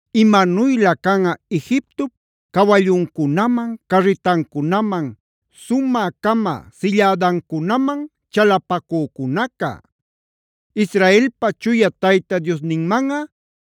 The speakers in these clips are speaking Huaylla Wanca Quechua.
¡Imanuylä canꞌa Egiptop cawalluncunaman, carritancunaman, sumä-cama sillädancunaman chalapacücunaca! Israelpa Chuya Tayta Diosninmanꞌa,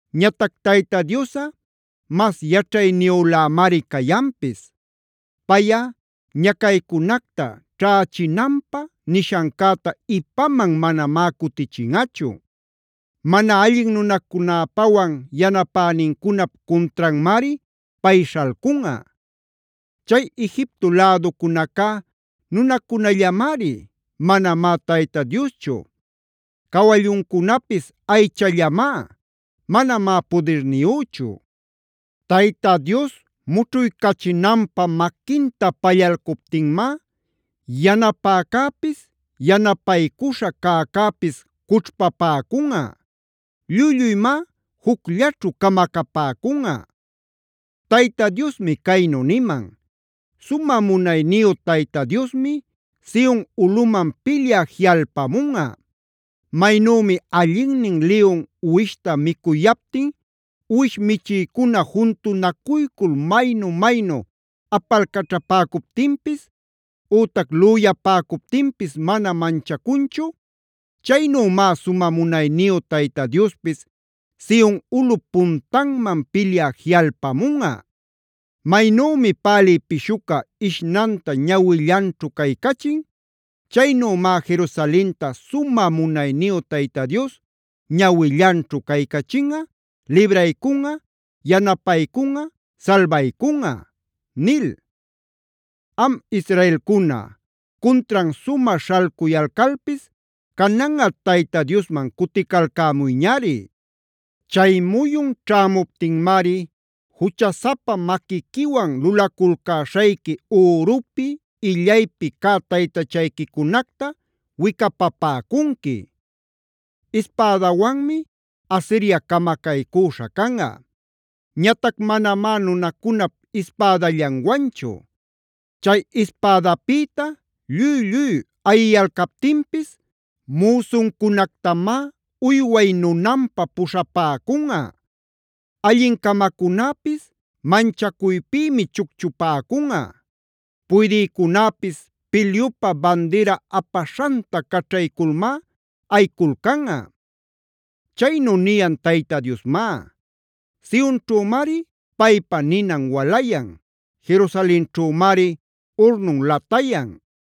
Ñatac Tayta Diosꞌa mas yaćhayniyülämari cayanpis. Payꞌa ñacaycunacta ćhächinanpä nishancäta ipaman manamá cutichinꞌachu. Mana allin nunacunäpawan yanapänincunap cuntranmari pay śhalcunꞌa. Chay Egipto läducunacá nunacunallamari; manamá Tayta Dioschu. Cawalluncunapis aychallamá; manamá pudirniyüchu. Tayta Dios mućhuycachinanpä maquinta pallalcuptinmá, yanapäcäpis, yanapaycuśha cäcäpis cućhpapäcunꞌa; lluy-lluymá jucllaćhu camacapäcunꞌa. Tayta Diosmi caynu niman: “Sumä munayniyu Tayta Diosmi Sion ulꞌuman pilyä jiꞌalpamunꞌa. Maynümi allinnin liyun uwishta micuyaptin uwish michïcuna juntunacuycul maynu-maynu apalcaćhapäcuptinpis ütac lüyapäcuptinpis mana manchacunchu; chaynümá sumä munayniyu Tayta Diospis Sion ulꞌup puntanman pilyä jiꞌalpamunꞌa. Maynümi pälï pishuca ishñanta ñawillanćhu caycachin; chaynümá Jerusalenta sumä munayniyu Tayta Dios ñawillanćhu caycachinꞌa, libraycunꞌa, yanapaycunꞌa, salbaycunꞌa” nil. Am Israelcuna, cuntran sumä śhalcuyalcalpis cananꞌa Tayta Diosman cuticalcämuyñari. Chay muyun ćhämuptinmari juchasapa maquiquiwan lulaculcäśhayqui ürupi, illaypi cä taytachayquicunacta wicapapäcunqui. Ispädawanmi Asiria camacaycüśha canꞌa, ñatac manamá nunacunap ispädallanwanchu. Chay ispädapïta lluy-lluy ayiyalcaptinpis, müsuncunactamá uyway nunanpä puśhapäcunꞌa. Allin-camacunäpis manchacuypïmi chucchupäcunꞌa. Puydïcunäpis pilyupä bandira apaśhanta caćhayculmá ayiculcanꞌa. Chaynu niyan Tayta Diosmá; Sionćhümari paypa ninan walayan, Jerusalenćhümari urnun latayan.